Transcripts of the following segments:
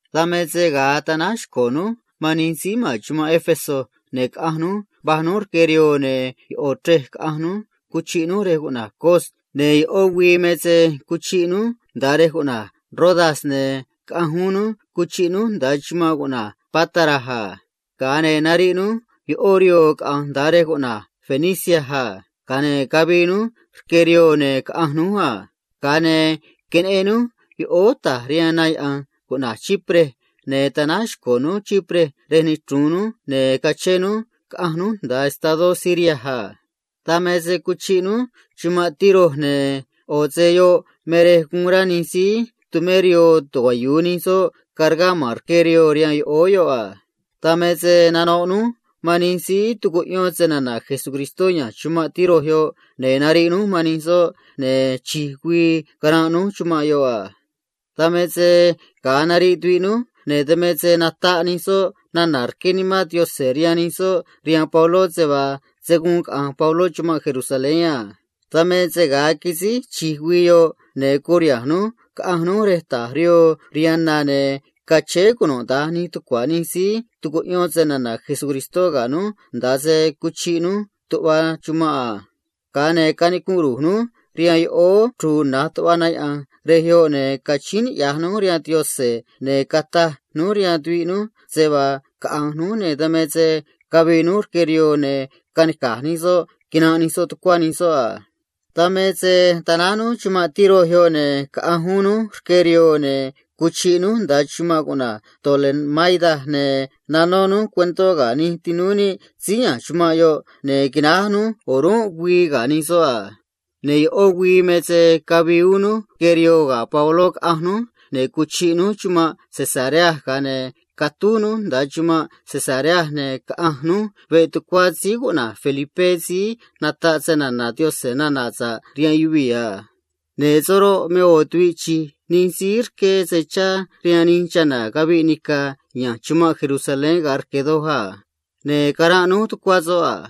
Dan me se ga̱a tanáj xco̱ núj man nij síí ma̱n chumanꞌ Éfeso, ne̱ caꞌanj núj vaj núj rque rihoo chéé rihaan na, ne̱ ꞌo̱ chrej caꞌanj núj, cuchiꞌ núj rej cuꞌna̱j Cos, ne̱ ꞌó güii me se cuchiꞌ núj nda̱a rej cuꞌna̱j Rodas, ne̱ caꞌanj uún núj, cuchiꞌ núj nda̱a chumanꞌ cuꞌna̱j Pátara a. Ga̱a ne̱ nariꞌ núj ꞌó rihoo caꞌa̱nj nda̱a estadó cuꞌna̱j Fenicia a. Ga̱a ne̱ cavii núj rque rihoo, ne̱ caꞌanj núj a. Ga̱a ne̱ queneꞌen núj yoꞌóó ta̱j rihaan na yaꞌa̱nj cuꞌna̱j Chipre, ne̱ tanáj xco̱ núj Chipre rej nichru̱un núj, ne̱ cachén núj caꞌanj núj nda̱a estadó Siria a. Dan me se cuchiꞌ núj chumanꞌ Tiro, ne̱ yoꞌ me rej guun rá nij síí tumé rihoo tucuayu̱u nij soꞌ cargá ma̱n rque rihoo rihaan yoꞌóó yoꞌ a. Dan me se nanoꞌ núj man nij síí tucuꞌyón snana̱ Jesucristó ya̱nj chumanꞌ Tiro yoꞌ, ne̱ nariꞌ núj man nij soꞌ, ne̱ chi̱j güii caranꞌ núj chumanꞌ yoꞌ a. Dan me se ga̱a nariꞌ tuviꞌ núj, ne̱ dan me se nataꞌ nij soꞌ nana̱ rqué Nimán Yaꞌanj rihaan nij soꞌ rihaan Pabló se vaa se̱ guun caꞌa̱nj Pabló chumanꞌ Jerusalén a. Dan me se ga̱a quisíj chi̱j güii yoꞌ, ne̱ curiha̱nj núj caꞌanj núj rej ta̱j rihoo rihaan na, ne̱ cachéé cunuda̱nj nij tucua̱ nij síí tucuꞌyón snana̱ Jesucristó ga̱ núj nda̱a se cuchiꞌ núj tuꞌva chumanꞌ a. Ga̱a ne̱ cayáán ru̱j núj rihaan yoꞌóó chru̱u̱ na̱j tuꞌva na yaꞌa̱nj rej yoꞌ, ne̱ cachíín niꞌya̱j núj rihaan Yaꞌanj a. Ne̱ cataj núj rihaan tuviꞌ núj se vaa caꞌa̱nj núj, ne̱ dan me se cavii núj rque rihoo, ne̱ canica̱j nij soꞌ quinanꞌ nij soꞌ tucuá nij soꞌ a. Dan me se tanáj núj chumanꞌ Tiro yoꞌ, ne̱ caꞌanj uún núj rque rihoo, ne̱ cuchiꞌ núj nda̱a chumanꞌ cuꞌna̱j Tolemaida a. Ne̱ nanó núj cuentó ga̱ nij tinúú níꞌ síí ya̱nj chumanꞌ yoꞌ, ne̱ quináj núj o̱rúnꞌ güii ga̱ nij soꞌ a. Ne̱ ꞌó güii me se cavii uún núj rque rihoo ga̱ Pabló, caꞌanj núj, ne̱ cuchiꞌ núj chumanꞌ Cesarea a. Ga̱a ne̱ catúj núj nda̱a chumanꞌ Cesarea, ne̱ caꞌanj núj veꞌ tucuá síí cuꞌna̱j Felipé síí ata̱ suun nata̱ꞌ nana̱ sa̱ꞌ cheꞌé Jesucristó a. Ne̱ soꞌ roꞌ, me ꞌo̱ tuviꞌ chi̱j nij síí rqué se chá rihaan nij chana̱ caviꞌ nica̱ ya̱nj chumanꞌ Jerusalén ga̱a rque̱ doj a. Ne̱ caranꞌ núj tucuá soꞌ a.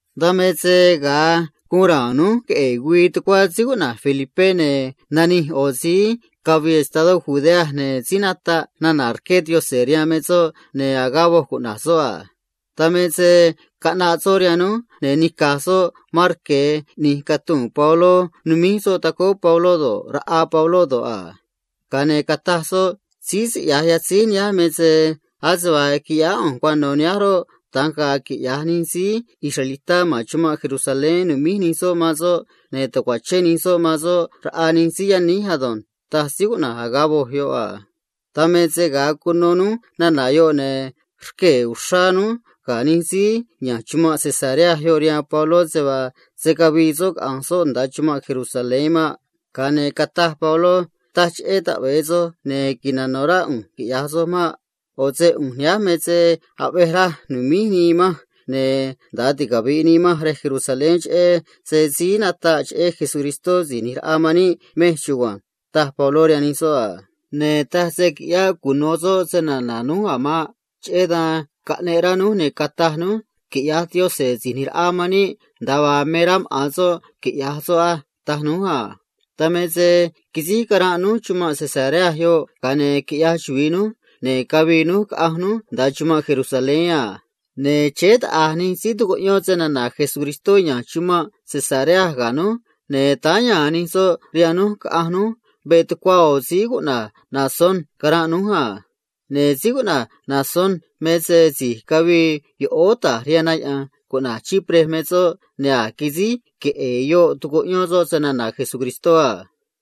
Dan me se ga̱a guun ra̱a̱n núj queꞌe̱e̱ güii tucuá Felipé, ne̱ nanij ꞌo̱ síí cavii estadó Judea, ne̱ síí nataꞌ nana̱ rqué Yaꞌanj rihaan me soꞌ, ne̱ Agabo cuꞌna̱j soꞌ a. Dan me se caꞌnaꞌ soꞌ rihaan núj, ne̱ nica̱j soꞌ marque̱ ꞌni̱j catuu̱n Pabló, numíj soꞌ tacóó maꞌa̱n soꞌ do̱ꞌ, raꞌa soꞌ do̱ꞌ a. Ga̱a ne̱ cataj soꞌ a: ―Nihánj me se taj Nimán Yaꞌanj a: “Síí siꞌya̱j yatzíj nihánj me se ase vaa quiꞌyáá ꞌu̱nj cuano̱ nihánj roꞌ, da̱nj ga̱a̱ quiꞌya̱j nij síí israelitá ma̱n chumanꞌ Jerusalén, nu̱míj nij soꞌ man soꞌ, ne̱ ta̱cuachén nij soꞌ man soꞌ raꞌa nij síí yaníj ado̱nj” ―taj Agabo a. Dan me se ga̱a cuno núj nana̱ yoꞌ, ne̱ rquee̱ uxrá núj ga̱ nij síí ya̱nj chumanꞌ Cesarea yoꞌ man Pabló se vaa se̱ cavii soꞌ caꞌa̱nj soꞌ nda̱a chumanꞌ Jerusalén maꞌ. Tza̱j ne̱ cataj Pabló a: ―Taj cheꞌé taꞌve̱e soj ne̱ nano̱ rá ꞌu̱nj quiꞌya̱j soj maꞌ. ꞌO̱ se ꞌu̱nj nihánj me se aꞌvej raj nu̱míj nii manj ne̱ nda̱a ticavi̱ꞌ nii manj rej Jerusalén cheꞌé se‑chuvi̱i Jesús Si̱j ꞌNi̱j Raꞌa man níꞌ chugua̱nj ―taj Pabló rihaan nij soꞌ a. Ne̱ taj se quiꞌyáꞌ cuno̱ soꞌ snana̱ núj a̱ maꞌ. Cheꞌé dan caꞌneꞌ rá núj, ne̱ cataj núj a: ―Quiꞌya̱j Síí ꞌNi̱j Raꞌa man níꞌ nda̱a vaa me rá maꞌa̱n soꞌ quiꞌya̱j soꞌ á ―taj núj a. Dan me se quisíj caranꞌ núj chumanꞌ Cesarea yoꞌ, ga̱a ne̱ quiꞌyaj chuvi̱i núj, ne̱ cavii núj caꞌanj núj nda̱a chumanꞌ Jerusalén a. Ne̱ chéé taꞌa̱j nij síí tucuꞌyón snana̱ Jesucristó ya̱nj chumanꞌ Cesarea ga̱ núj, ne̱ táá ya̱a̱n nij soꞌ rihaan núj caꞌanj núj veꞌ tucuá ꞌo̱ síí cuꞌna̱j Mnasón, cara̱nꞌ núj a. Ne̱ síí cuꞌna̱j Mnasón me se si̱j cavii yoꞌóó ta̱j rihaan na yaꞌa̱nj cuꞌna̱j Chipre me soꞌ, ne̱ a̱j quisíj queꞌe̱e̱ yoꞌ tucuꞌyón soꞌ snana̱ Jesucristó a.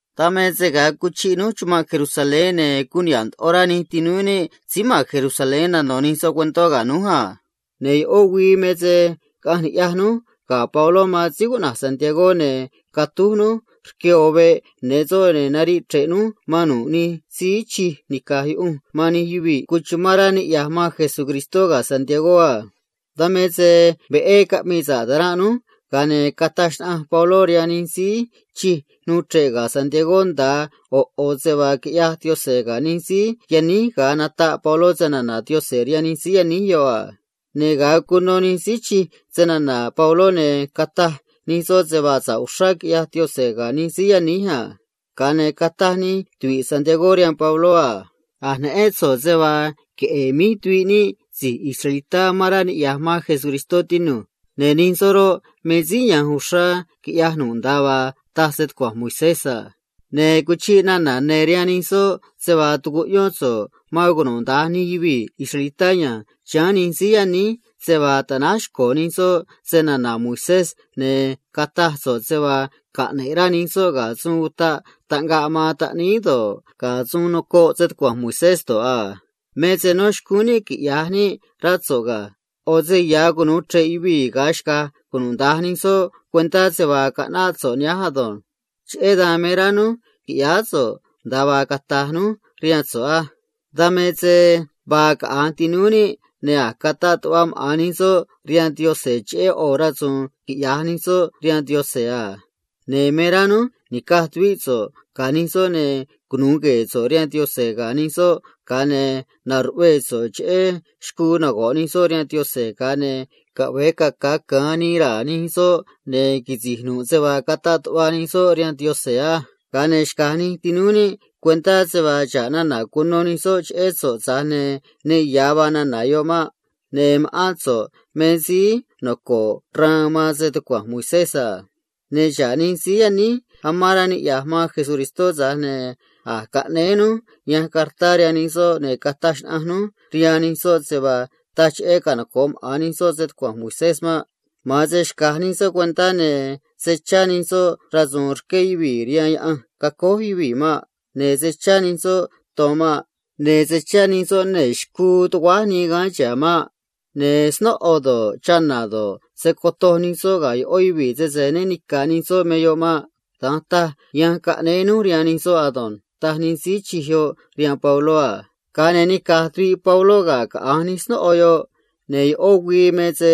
Dan me se ga̱a cuchiꞌ núj chumanꞌ Jerusalén, ne̱ guun niha̱ꞌ ndoꞌo rá nij tinúú níꞌ síí ma̱n Jerusalén nano̱ nij soꞌ cuentó ga̱ núj a. Ne̱ ꞌó güii me se caꞌanj ni̱ꞌyaj núj ga̱ Pabló man síí cuꞌna̱j Jacobo ne̱ catúj núj rque ꞌo̱ veꞌ ne̱ soꞌ, ne̱ nariꞌ chre̱ꞌ núj man nu̱ꞌ nij síí tumé sa̱ꞌ rihaan Yaꞌanj man nij yuvii̱ noco̱ꞌ man Cristó ga̱ Jacobo a. Dan me se veꞌé caꞌmii sa̱ꞌ ta̱ranꞌ núj, ga̱a ne̱ cataj xnaꞌanj Pabló rihaan nij síí chij nuu chre̱ꞌ ga̱ Jacobo nda̱a ꞌo̱ ꞌo̱ se vaa quiꞌyaj Yaꞌanj scaꞌnúj nij síí yaníj ga̱a nataꞌ Pabló snana̱ Yaꞌanj rihaan nij soꞌ a. Ne̱ ga̱a cuno nij síí chij snana̱ Pabló, ne̱ cataj nij soꞌ se vaa sa̱ꞌ uxrá quiꞌyaj Yaꞌanj ga̱ nij síí yaníj a. Ga̱a ne̱ cataj nij tuvi̱ꞌ Jacobo rihaan Pabló a: ―A̱j neꞌén so̱ꞌ se vaa queꞌe̱e̱ míj tuviꞌ níꞌ si̱j israelitá amán rá niꞌya̱j man Jesucristó, tinu̱j. Ne̱ nij soꞌ roꞌ, me síí ya̱nj uxrá quiꞌya̱j nu̱ꞌ nda̱a vaa taj stucua̱nj Moisés a. Ne̱ cuchiꞌ nana̱ ne̱ rihaan nij soꞌ se vaa tucuꞌyón so̱ꞌ man cunuda̱nj nij yuvii̱ israelitá ya̱nj chiháán nij síí yaníj se vaa ta̱náj xco̱ nij soꞌ snana̱ Moisés, ne̱ cataj so̱ꞌ se vaa caꞌne̱ꞌ rá nij soꞌ ga̱ suun utaꞌ taꞌngaꞌ man taꞌníí do̱ꞌ, ga̱ suun nocoꞌ stucua̱nj Moisés do̱ꞌ a. Me se no̱ xcúún níꞌ quiꞌya̱j níꞌ, rá so̱ꞌ ga̱. ꞌO̱ se ya̱ cunu̱u chre̱ꞌ cunuda̱nj nij yuvii̱ yoꞌ ga̱a xca̱j nij soꞌ cuentá se vaa caꞌnáꞌ so̱ꞌ nihánj ado̱nj. ’Cheꞌé dan me rá núj qui̱ꞌyáá so̱ꞌ nda̱a vaa cata̱j núj rihaan so̱ꞌ á. Dan me se vaa caꞌa̱nj tinúú níꞌ, ne̱ a̱j cataꞌ tuꞌva maꞌa̱n nij soꞌ rihaan Yaꞌanj cheꞌé ꞌo̱ rasu̱u̱n quiꞌya̱j nij soꞌ rihaan Yaꞌanj a. Ne̱ me rá núj ni̱caj tuvíꞌ so̱ꞌ ga̱ nij soꞌ, ne̱ cunu̱u gue̱e̱ so̱ꞌ rihaan Yaꞌanj ga̱ nij soꞌ, ga̱a ne̱ na̱ruꞌvee so̱ꞌ cheꞌé xcuu nago̱ꞌ nij soꞌ rihaan Yaꞌanj, ga̱a ne̱ caꞌve̱e caca̱ ca̱an nii raa̱ nij soꞌ ne̱ quisi̱j nu̱ꞌ se vaa cataꞌ tuꞌva nij soꞌ rihaan Yaꞌanj á. Ga̱a ne̱ xca̱j nij tinúú níꞌ cuentá se vaa xa̱ꞌ nana̱ cuno nij soꞌ cheꞌé so̱ꞌ, tza̱j ne̱ ne ya̱ vaa nana̱ yoꞌ maꞌ. ꞌO̱ se so̱ꞌ me síí noco̱ꞌ xraan man stucua̱nj Moisés ado̱nj. ’Ne̱ xa̱ꞌ nij síí yaníj amán rá niꞌya̱j man Jesucristó, tza̱j ne̱ a̱j caꞌnéé núj yanj cartá rihaan nij soꞌ, ne̱ nataꞌ núj rihaan nij soꞌ se vaa taj cheꞌé canoco̱ꞌ maꞌa̱n nij soꞌ stucua̱nj Moisés maꞌ. Ma̱an se xca̱j nij soꞌ cuentá, ne̱ se̱ chá nij soꞌ rasu̱u̱n rqué yuvii̱ rihaan yaꞌanj quiꞌyaj maꞌa̱n yuvii̱ maꞌ. Ne̱ se̱ chá nij soꞌ ton maꞌ. Ne̱ se̱ chá nij soꞌ nee̱ xcuu tuguáj nii gaán chihá maꞌ. Ne̱ snóꞌo do̱ꞌ, chana̱ do̱ꞌ, se̱ cotoj nij soꞌ ga̱ ꞌó yuvii̱ sese né ni̱ca̱ nij soꞌ me yoꞌ maꞌ. Da̱nj taj yanj caꞌnéé núj rihaan nij soꞌ ado̱nj ―taj nij síí chij yoꞌ rihaan Pabló a. Ga̱a ne̱ nica̱j tuviꞌ Pabló ga̱ caꞌa̱nj nij snóꞌo yoꞌ, ne̱ ꞌó güii me se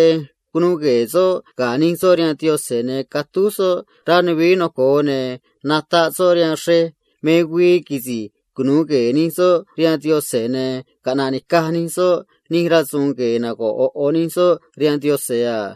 cunuu gue̱e̱ soꞌ ga̱ nij soꞌ rihaan Yaꞌanj a. Ga̱a ne̱ catúj soꞌ rej ya̱nj nuvií noco̱o, ne̱ nataꞌ soꞌ rihaan xrej me güii quisi̱j cunu̱u gue̱e̱ nij soꞌ rihaan Yaꞌanj ne̱ caꞌna̱ꞌ ni̱caj nij soꞌ nij rasu̱u̱n rque̱ ꞌo̱ ꞌo̱ nij soꞌ rihaan Yaꞌanj a.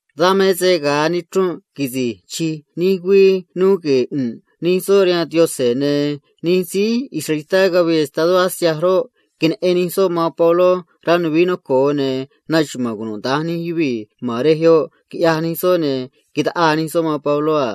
Dan me se ga̱a nichrunꞌ quisi̱j chi̱j nij güii nuu gue̱e̱ ꞌu̱nꞌ nij soꞌ rihaan Yaꞌanj, ne̱ va̱j taꞌa̱j nij síí israelitá cavii estadó Asia, ne̱ queneꞌen nij soꞌ man Pabló rej ya̱nj nuvií noco̱o a. Ne̱ naxuma̱a̱n cunuda̱nj nij yuvii̱ ma̱n rej yoꞌ, quiꞌyaj nij soꞌ, ne̱ taꞌaa nij soꞌ man Pabló a.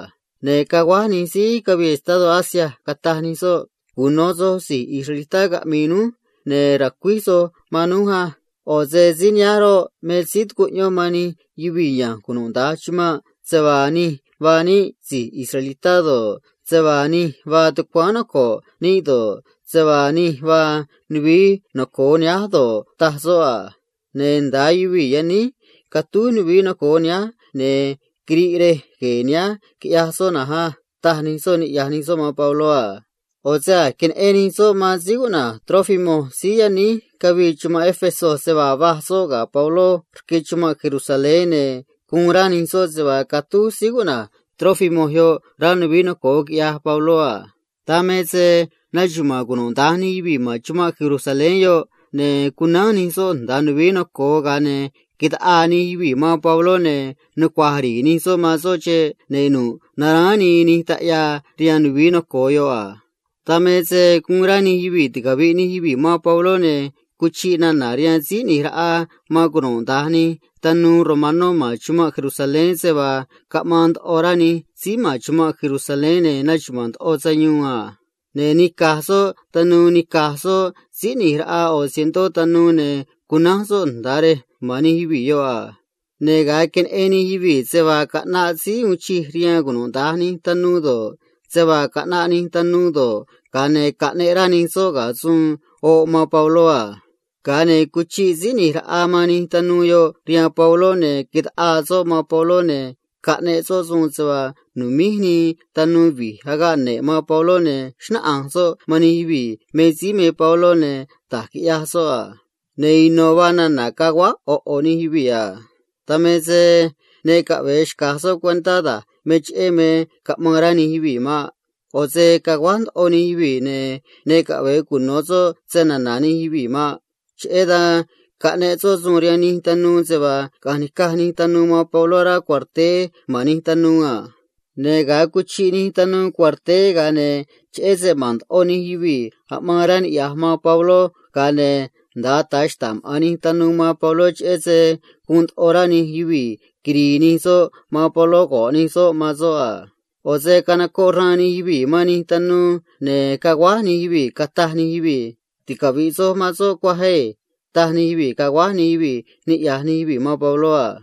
Ne̱ caguáj nij síí cavii estadó Asia, cataj nij soꞌ a: ―Cuno̱ soj si̱j israelitá caꞌmi̱i̱ núj, ne̱ ra̱cuíj soj man núj á. ꞌO̱ se síí nihánj roꞌ, me síí tucuꞌyón man nij yuvii̱ ya̱nj cunuda̱nj chumanꞌ se vaa nij vaa níꞌ si̱j israelitá do̱ꞌ, se vaa nij vaa tucuáán noco̱ꞌ níꞌ do̱ꞌ, se vaa nij vaa nuvií noco̱o nihánj do̱ꞌ a. Ne̱ nda̱a yuvii̱ yaníj catúj rej ya̱nj nuvií noco̱o nihánj, ne̱ quiriꞌ rej gue̱e̱ nihánj, quiꞌyaj soꞌ na̱nj á ―taj nij soꞌ, niꞌya̱j nij soꞌ man Pabló a. ꞌO̱ se a̱j queneꞌen nij soꞌ man síí cuꞌna̱j Trófimo síí yaníj cavii chumanꞌ Éfeso se vaa va̱j soꞌ ga̱ Pabló rque chumanꞌ Jerusalén, ne̱ guun rá nij soꞌ se vaa catúj Trófimo rej ya̱nj nuvií noco̱o, quiꞌyaj Pabló a. Dan me se naxuma̱a̱n cunuda̱nj nij yuvii̱ ma̱n chumanꞌ Jerusalén, ne̱ cunánj nij soꞌ nda̱a rej ya̱nj nuvií noco̱o, ga̱a ne̱ taꞌaa nij yuvii̱ man Pabló, ne̱ nucua̱j ri̱i̱ nij soꞌ man soꞌ nda̱a xeꞌ, ne̱ nu̱ꞌ naráán nii nij taꞌyaa rihaan rej ya̱nj nuvií noco̱o yoꞌ a. Dan me se guun rá nij yuvii̱ ticavi̱ꞌ nij yuvii̱ man Pabló, ne̱ cuchiꞌ nana̱ rihaan tanuu uun chij doj rihaan cunuda̱nj nij tanuu romanó ma̱n chumanꞌ Jerusalén se vaa caꞌmaan ndoꞌo rá nij síí ma̱n chumanꞌ Jerusalén ne̱ naxuma̱a̱n ndoꞌo sayuun a. Ne̱ nica̱j soꞌ tanuu do̱ꞌ, tanuu capitán ꞌni̱j raꞌa cientó tanuu do̱ꞌ, ne̱ cunánj soꞌ nda̱a rej ma̱n nij yuvii̱ yoꞌ a. Ne̱ ga̱a queneꞌen nij yuvii̱ se vaa caꞌnaꞌ tanuu uun chij doj rihaan cunuda̱nj nij tanuu do̱ꞌ, se vaa caꞌnaꞌ nij tanuu do̱ꞌ, ga̱a ne̱ caꞌneꞌ rá nij soꞌ ga̱ suun oꞌ man Pabló a. Ga̱a ne̱ cuchiꞌ tanuu uun chij doj yoꞌ rihaan Pabló, ne̱ taꞌaa soꞌ man Pabló, ne̱ caꞌneꞌ soꞌ suun se vaa nu̱míj nij tanuu vi̱j agaꞌ ne̱ꞌ man Pabló, ne̱ xnáꞌanj soꞌ man nij yuvii̱ me síí me Pabló ne̱ da̱j quiꞌyaj soꞌ a. Ne̱ ino̱ vaa nana̱ caguáj ꞌo̱ ꞌo̱ nij yuvii̱ nuu chre̱ꞌ rej yoꞌ a. Dan me se ne caꞌve̱e xca̱j soꞌ cuentá da̱j me cheꞌé me caꞌmaan rá nij yuvii̱ maꞌ. ꞌO̱ se caguáj ndoꞌo nij yuvii̱, ne̱ ne caꞌve̱e cuno̱ soꞌ snana̱ nij yuvii̱ maꞌ. Cheꞌé dan caꞌneꞌ soꞌ suun rihaan nij tanuu se vaa caꞌa̱nj ni̱caj nij tanuu man Pabló rá cuarteé ma̱n nij tanuu a. Ne̱ ga̱a cuchiꞌ nij tanuu cuarteé, ga̱a ne̱ cheꞌé se ma̱n ndoꞌo nij yuvii̱ aꞌmaan rá niꞌya̱j man Pabló, ga̱a ne̱ nda̱a ata̱ xta̱ꞌ maꞌa̱n nij tanuu man Pabló, cheꞌé se guun ndoꞌo rá nij yuvii̱ quiri̱i̱ nij soꞌ man Pabló go̱ꞌ nij soꞌ man soꞌ a. ꞌO̱ se canocoꞌ xraan nij yuvii̱ man nij tanuu, ne̱ caguáj nij yuvii̱, cataj nij yuvii̱ a: ―Ticavi̱ꞌ soj man soꞌ cuaj ei ―taj nij yuvii̱, caguáj nij yuvii̱, niꞌya̱j nij yuvii̱ man Pabló a.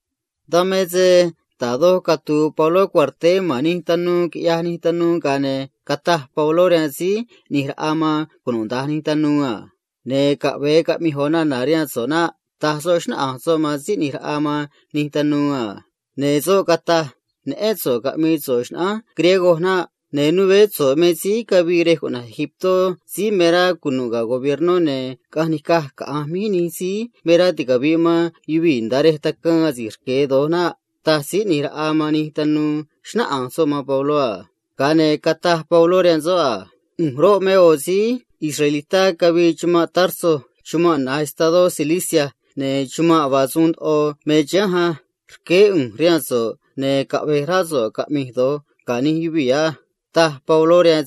Dan me se da̱j doj catu̱u̱ Pabló cuarteé ma̱n nij tanuu romanó, quiꞌyaj nij tanuu, ga̱a ne̱ cataj Pabló rihaan tanuu uun chij doj a: ―Caꞌve̱e cata̱j ꞌo̱ nana̱ rihaan so̱ꞌ naꞌ ―taj Pabló, xnáꞌanj soꞌ man tanuu uun chij yoꞌ a. Ne̱ soꞌ cataj a: ―Neꞌén so̱ꞌ caꞌmi̱i̱ so̱ꞌ xnaꞌánj griego naꞌ. Ne̱ né so̱ꞌ me síí cavii yoꞌóó Egiptó síí me rá cunu̱ꞌ ga̱ gobiernó ne̱ caꞌanj nica̱j caꞌa̱nj míj nij síí me rá ticavi̱ꞌ man yuvii̱ nda̱a rej tacaan asi̱j rque̱ do̱j naꞌ ―taj tanuu uun chij doj, xnáꞌanj soꞌ man Pabló a. Ga̱a ne̱ cataj Pabló rihaan soꞌ a: ―ꞌU̱nj roꞌ, me ꞌo̱ síí israelitá cavii chumanꞌ Tarso chumanꞌ na̱j estadó Cilicia, ne̱ chumanꞌ noco̱o ndoꞌo me chihánj á. Rqueé ꞌu̱nj rihaan so̱ꞌ, ne̱ caꞌve̱j rá so̱ꞌ caꞌmi̱j do̱j ga̱ nij yuvii̱ á ―taj Pabló rihaan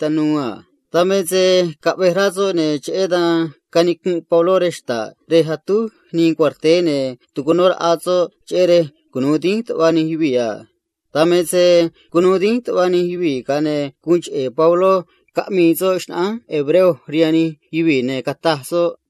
tanuu uun chij doj a. Dan me se caꞌvej rá soꞌ, ne̱ cheꞌé dan canicunꞌ Pabló rej xta̱ꞌ rej atúj nii cuarteé, ne̱ tucunó raꞌa soꞌ, cheꞌé rej cunu̱u dínj tuꞌva nij yuvii̱ a. Dan me se cunuu dínj tuꞌva nij yuvii̱, ga̱a ne̱ guun cheꞌe̱ Pabló caꞌmii soꞌ se‑xnaꞌa̱nj maꞌa̱n nij síí hebreo rihaan nij yuvii̱, ne̱ cataj soꞌ a: